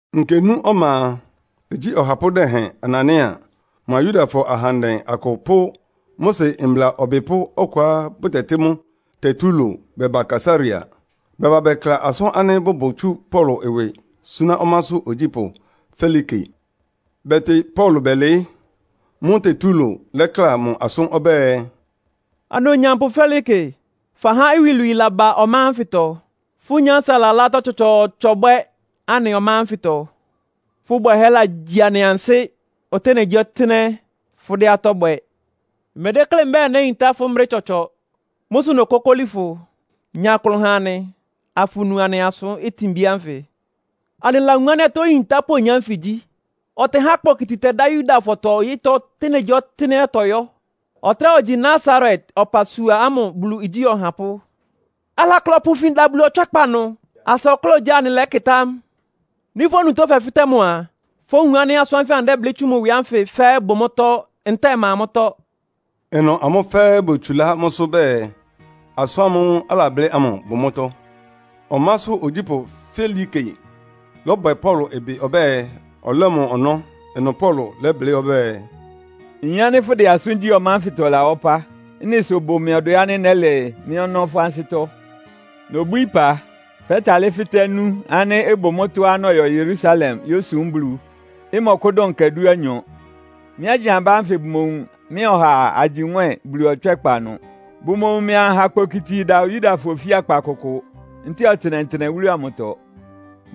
Nkenú ɔma a, igyí ɔhapʋ́ dɛhɛn Anania mʋa Yudafɔ ahandɛ akʋ pʋ́ Mose mbla ɔbɩpʋ́ ɔkʋá bʋtɛtɩ́ mʋ Tertulo bɛba Kaesarea. Bɛbá bɛkla asʋ́n ánɩ́ bʋbʋ tsu Paulo ɩwɩ súná ɔmásʋ́ ogyípʋ́ Felike. Bɛtɩ Paulo bɛlɩɩ́. Mʋ́ʋ́ Tetulo lɛ́kla mʋ asʋ́n ɔbɛ́ɛ, “Onumnyampʋ Felike, fahá iwilwii laba ɔmá ánfɩtɔ. Fʋ́ nyánsa lalá atɔ́ tsɔtsɔɔtsɔ bwɛ́ anɩ ɔmá ánfɩtɔ. Fʋ́ bwɛhɛ́ legyi anɩ ansɩ́ ɔtɩ́nɛgyíɔtɩ́nɛ́. Fʋ́dɛ́ atɔ́ bwɛ. Mmedéklé mbɛ́ɛ néyintá fʋ́ brɛ́ tsɔtsɔ. Mʋ́ sʋ nokókóli fʋ, nya klʋn ha anɩ, afunu anɩ asʋ́n tinbí ánfɩ. Anɩlawun ánɩ́ atɔ́ oyintápʋ́ oyin ánfɩ gyí. Ɔtɛhá kpokiti tɛdá Yudafɔtɔ ɔyɩ́tɔ́ ɔtɩ́nɛgyíɔtɩ́nɛ́á ɔtɔyɔ́. Ɔtráa ogyi Nasaret ɔpasua ámʋ Bulu igyí ɔhapʋ́. Alakle ɔpʋ ifin da Bulu ɔtswɛ́kpa ɩnʋ, asa ɔkláa ogyá anɩlɛ́kɩtá mʋ. Nɩ́ fʋ́ onutó fɛfɩ́tɛ́ mʋ a, fówun ánɩ́ asʋ́n ánfɩ anɩdɛ́blɩ́ tsú mʋ ɩwɩ ánfɩ fɛ́ɛ́ bʋ mʋ́tɔ́ ntɛ́ɛ ɩma mʋ́tɔ́.” Ɩnʋ ámʋ fɛ́ɛ́ botsulá mʋ́sʋ́ bɛɛ, asʋ́n ámʋ́ʋ́ alablɩ́ ámʋ bʋ mʋ́tɔ́. Ɔmásʋ́ ogyípʋ́ Felike lɔ́bwɛ Paulo ɩbɩ ɔbɛ́ɛ, ɔlɛ́ mʋ ɔnɔ́. Ɩnʋ Paulo lɛ́blɩ́ ɔbɛ́ɛ, “Nyin ánɩ́ fʋdɛ asʋ́n gyí ɔmá ánfɩtɔ ɩlawá ɔpá. Ɩ́nɩ sʋ ɩbʋ mɩ ɔdwɛ ánɩ́ nɛ́lɛ mɩ́ ɔnɔ́ fʋ́ ansɩ́tɔ́. Nobwíí ɩpa, fɛ́talɩ́ fɩ́tɛ́ nú ánɩ́ ɩbʋ mʋ́tɔ́á nɔyɔ Yerusalem yósum Bulu, ɩmɔkʋ́dʋn nkɛ dúanyɔ. Mɩ́ anyabá ánfɩ bʋmowun mɩ́a ɔhaa agyi nwɛ́ɛn Bulu ɔtswɛ́kpa ɩnʋ. Bʋmowun mɩ́ anha kpokiti ɩda Yudafɔ ofíakpa kʋkʋ ntɛ́ɛ ɔtɩnɛtɩnɛ wúlu amʋtɔ.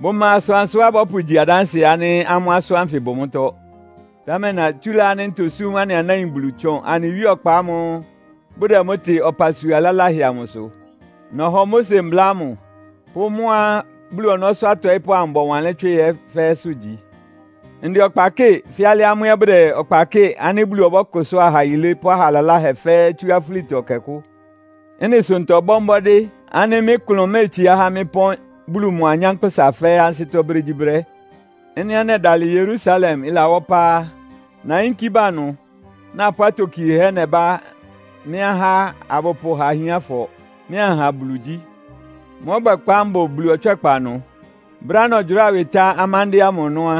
Bʋma asʋansʋá bɔ́pʋgyi adánsɩɛ ánɩ́ amʋ́ asʋ́n ánfɩ bʋ mʋ́tɔ́. Támɛ natsúlá ánɩ́ ntosúm anɩ anáin Bulu tsʋn anɩ Wíe Ɔkpa ámʋ́ʋ́ bʋdɛ mʋ́ tɩ ɔpasua laláhɛ amʋsʋ. Nɔhɔ Mose Mbla ámʋ pʋ́ mʋ́á Bulu ɔnɔ́sʋ́ atɔɩ́pʋ́ amʋ bɔwanlɩ́n tswɩ ɛ́ fɛ́ɛ́sʋ́ gyi. Ndɛ ɔkpa kɩ́ɩ fɛ́ alɩá amʋ́ ɛ́ bʋdɛ ɔkpa kɩ́ɩ ánɩ́ Bulu ɔbɔ́kʋsʋ́a aha yilé pʋ́ aha laláhɛ fɛ́ɛ́ tsú afúlitɔ ɛkɛ kʋ́. Ɩ́nɩ sʋ ntɔbɔ́ mbɔ́dɩ́ ánɩ́ mɩ́ klʋn méetsiá há mɩ́ pɔ́n Bulu mʋa anyánkpʋ́sa fɛ́ɛ́ ansɩ́tɔ́ brégyíbrɛ́. “Ɩ́nɩá nɛdalɩ Yerusalem ɩlawá ɔpá á, nayínkí ba ɩnʋ, napʋ́ atokiehɛ́ nɛbá mɩ́ ahá abʋpʋha ahiánfɔ, mɩ́ anha Bulu igyí. Mʋ́ ɔbwɛkpá mbʋ Bulu ɔtswɛ́kpa ɩnʋ. Brɛ́á nɔgyʋráa ɩwɩ tá amándɩ́ɛ́ ámʋ ɔnɔ́ á,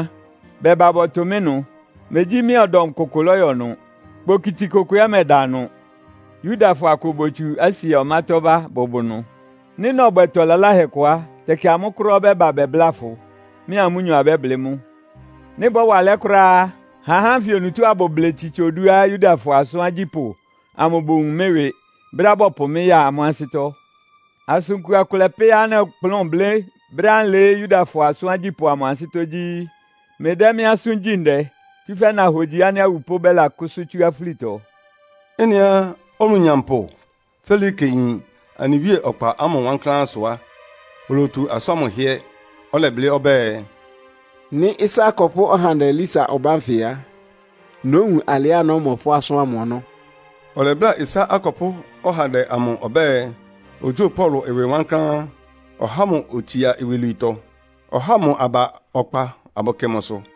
bɛba bɔtʋ mɩ́ ɩnʋ. Megyí mɩ́a ɔdɔm kʋkʋ lɔ́yɔ ɩnʋ. Kpokiti kʋkʋ ɛ́ mɛda ɩnʋ. Yudafɔ akʋ botsu Asia ɔmátɔ́ ba bʋbʋ ɩnʋ. Nɩ́ nɔbwɛ ɩtɔ laláhɛ kʋ á, tɛkɩ amʋ́ kʋ́ráá ɔbɛ́ba bɛbláa fʋ, mɩ́a amʋ́nyɔ abɛ́blɩ́ mʋ́. Nɩ́ ɩbɔ́wa alɛ́ kʋ́ráá á, ha ahá ánfɩ onutó abʋblɩ tsitsa oduá Yudafɔ asʋ́n agyípʋ́ amʋ bowun mɩ́ ɩwɩ, brɛ́á bɔpʋ mɩ́ ya amʋ́ ansɩ́tɔ́. Asʋn kua kʋlɛ pɛ́á nɔkplʋ́n blɩ́ brɛ́á nlɩɩ́ Yudafɔ asʋ́n agyípʋ́ amʋ ansɩ́tɔ́ gyí, ‘Mlɩdɛ́ mɩ́ asʋ́n gyí ndɛ, tsúfɛ́ nohogyi ánɩ́ awupʋ́ bɛ́lakʋ́sʋ́ tsú afúlitɔ.’” Ɩ́nɩá onumnyampʋ Felike yin anɩ Wíe ɔkpa ámʋ wankláán sʋ á, olotu asʋ́n ámʋ hɩ́ɛ́. Ɔlɛblɩ́ ɔbɛ́ɛ, “Nɩ́ ɩsá akɔpʋ́ ɔhandɛ Lisia ɔbá nfɩ á, nówun alɩá nɔ́mɔ asʋ́n ámʋ ɔnɔ́.” Ɔlɛbláa ɩsá akɔpʋ́ ɔhandɛ ámʋ ɔbɛ́ɛ, ogyóo Paulo ɩwɩ wankláán, ɔha mʋ otsia iwilwiitɔ. Ɔhá mʋ aba ɔkpa abʋkɩ mʋsʋ.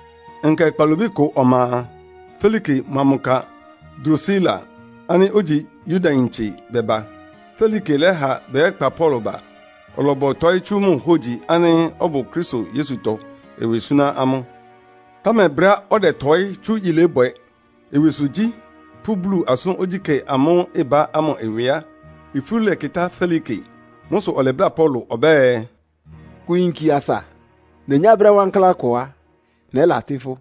Nkɛ kpalobí kʋ ɔma a, Felike mʋa mʋ ka Drusila ánɩ́ ogyi Yudayintse bɛba. Felike lɛ́ha bɛyɛ́kpa Paulo ba, ɔlɔbɔtɔɩ́ tsú mʋ hógyi ánɩ́ ɔbʋ Kristo Yesutɔ ɩwɩ súná amʋ́. Támɛ brɛ́á ɔdɛtɔɩ́ tsú yilébwɛ, ɩwɩsʋgyí pʋ́ Bulu asʋ́n ogyíkɛ́ amʋ́ʋ́ ɩbá ámʋ ɩwɩ á, ifú lɛkɩtá Felike. Mʋ́ sʋ ɔlɛbláa Paulo ɔbɛ́ɛ, “Kʋ yinki asa. Nenyá brɛ́ wankláán kʋ á, nɛ́latɩ́ fʋ́.”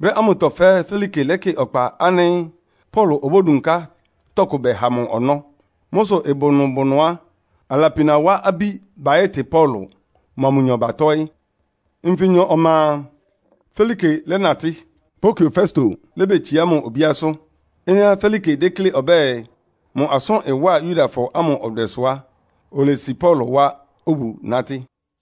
Brɛ́ ámʋtɔ fɛ́ɛ́ Felike lɛ́kɩ ɔkpa ánɩ́ Paulo obódunká tɔkʋ bɛha mʋ ɔnɔ́. Mʋ́ sʋ ɩbʋ nʋ bʋ ɩnʋ á, alapina wa abí bayɛ́tɩ Paulo, mʋa mʋnyɔ batɔ́ɩ́. Nfinyɔ ɔma a, Felike lɛ́natɩ́. Porkio Festo lébetsiá mʋ obíásʋ́. Ɩ́nɩá Felike déklé ɔbɛ́ɛ, mʋ asʋ́n ɩwá Yudafɔ ámʋ ɔdwɛ sʋ á, olesi Paulo wá obu nátɩ́.